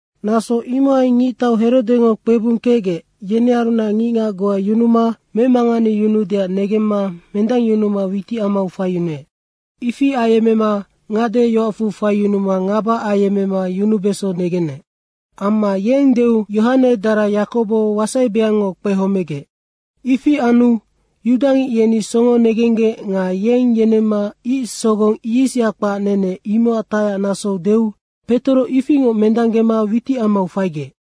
Naso imohai ngictau Herodengo kpebung kecgec, yenearunac ngicngac goa yunuma memanganeyunuudeac negemma mendangyunuma witicamau faiyunuec. Ifi ayemmema ngade yoacfu faiyunuma ngaba ayemmema yunubeso negenec. Amma yeng deu Yohane dara Yakobo wasaibeangngo kpehomegec. Ifi anu yudangic yeni songo negenggec nga yeng yenemma ic sogong yisya kpac nene, imocac tacyacnasou deu Petoro ifingoc mendanggema witicamau faigec.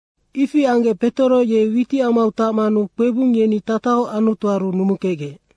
Ifi anggec Petoro ye witicamau tacmanu kpebung yeni tatahoc Anutuaru numukecgec.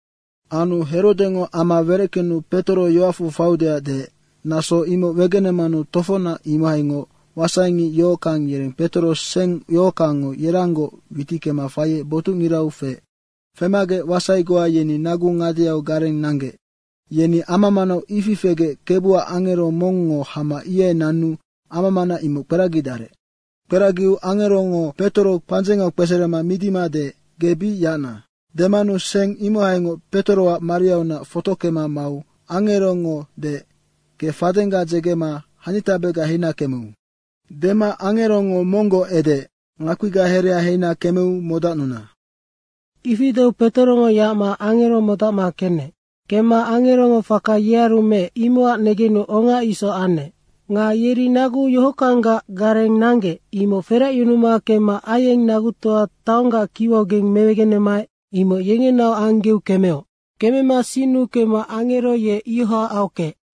Anu Herodengo ama wereckenu Petoro yoacfu faiudeac deec, naso imoc wegenemanu tofocnac imohaingoc wasaingic yohockang yereng Petoro seng yohockangngo yeranggoc witickema faiec botucngirau feec. Femagec wasai goa yeni nagu ngadeau gareng nanggec. Yeni ama manau ifi fegec Kebuac angero mongngo hama ihai nanu amamana imoc kperagidarec. Kperagiu angerongo Petoro pandzengau kpeserema midima deec, “Ge bic yacna.” demanu seng imohaingoc Petoroac mariaunac fotockema mau angerongo deec, “Ge fadengga dzegema hanitabega heina kemeu.” Dema angerongo monggoc edeec, “Ngakpiga herea heina kemeu modacnuna.” Ifi deu Petorongo yacma angero modacma kenec. Kemma angerongo faka yearu meec, imocac negenu onga isoc anec. Nga yeri nagu yohockanggac gareng nanggec, imoc feracyunuma kemma aieng nagutoa taonggac kiwaugeng mewegenemaec, imoc yengenaoc anggeu kemeoc. Kemema sinnu kemma angero ye ioha aockeec.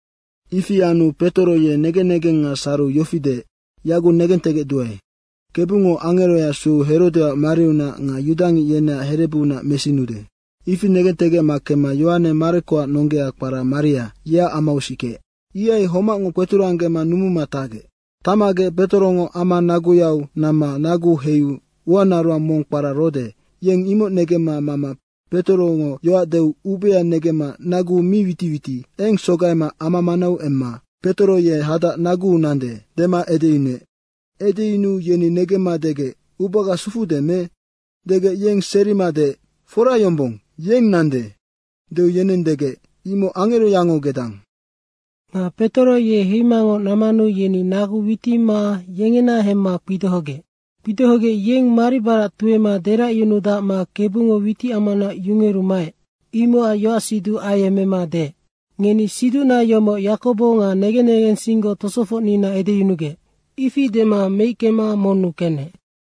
Ifi anu Petoro ye negen negenga sariu yofi deec, “Yaguc negentegecduae, Kebungo angeroya sueu Herodeac mariunac nga yudangic yeneac herebuunac mesinude.” Ifi negentegecma kemma Yohane Marekoac nonggea kpara Maria, yeac amau sikeec. Ihai homacngoc kpeturanggema numuma tacgec. Tacmagec Petorongo ama naguyau namma nagu heiu uanaroang mong kpara Rode, yeng imoc negemma mama Petorongo yoac deu ubea negemma nagu mi witiwiti, eng sogaima ama manau emma, “Petoro ye hadac naguu nande.” dema edeyunuec. Edeyunuu yeni negemma degec, “Ubaga sufude me?” degec, yeng serima deec, “Fora yombong, yeng nande.” deu yeneng degec, “Imoc angeroyango gedang.” Nga Petoro ye heimangoc nammanu yeni nagu witima yengena hemma kpidohogec. Kpidohogec yeng maribarac tuema deracyunudacma Kebungo witicamaunac yungeru maec, imocac yoacsiduc ayemmema deec, “Ngeni siducna yomoc Yakobo nga negen negensinggoc tosofocnina edeyunugec.” Ifi dema meickema monnu kenec.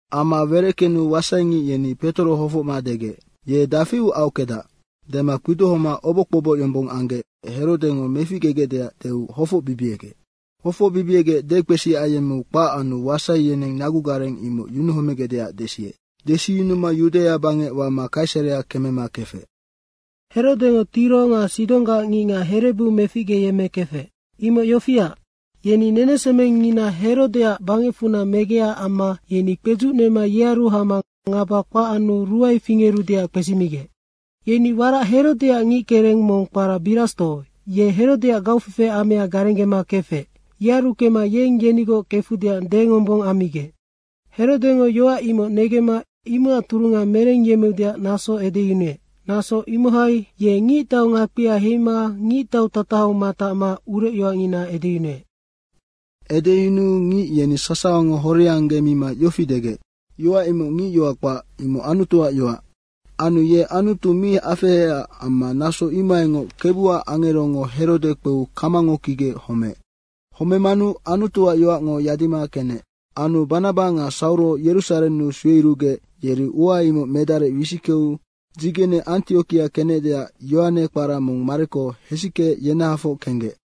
Ama wereckenu wasaingic yeni Petoro hofocma degec, “Ye dafiu aockedac?” dema kpidohoma oboc kpoboc yombong anggec Herodengo meficgegecdeac deu hofocbibiegec. Hofocbibiegec dekpesi ayemmeu kpac anu wasai yeneng nagugareng imoc yunuhomegecdeac desiec. Desiyunuma Yudaia bangec wama Kaisarea kemema kefec. Herodengo Tiro nga Sidonggac ngicngac herebu meficgeyemmekefec. Imoc yofiac, yeni nenesemengngina Herodeac bangecfunac megecac amma yeni kpedzucnema yearu hama ngaba kpac anu ruae fingerudeac kpesimigec. Yeni warac Herodeac ngickereng mong kpara Birasto, ye Herodeac gaufefe amea garenggema kefec, yearu kemma yeng yenigoc kefudeac dengombong ammigec. Herodengo yoac imoc negemma imocac turunga merengyemmeudeac naso edeyunuec. Naso imohai ye ngictau ngakpia heima ngictautatahau matacma urecyoacngina edeyunuec. Edeyunuu ngic yeni sasawango horianggemima yofi degec, “Yoac imoc ngicyoac kpac, imoc Anutuac yoac.” Anu ye Anutu mi afeheecac amma naso imohaingoc Kebuac angerongo Herode kpeu kamango kigec homeec. Homemanu Anutuac yoacngo yadima kenec. Anu Banaba nga Sauro Yerusarennu sueyurugec, yeri ua imoc medarec wisickeu dzigene Antiokia kenecdeac Yohane kpara mong Mareko hesickeec yenahafoc kenggec.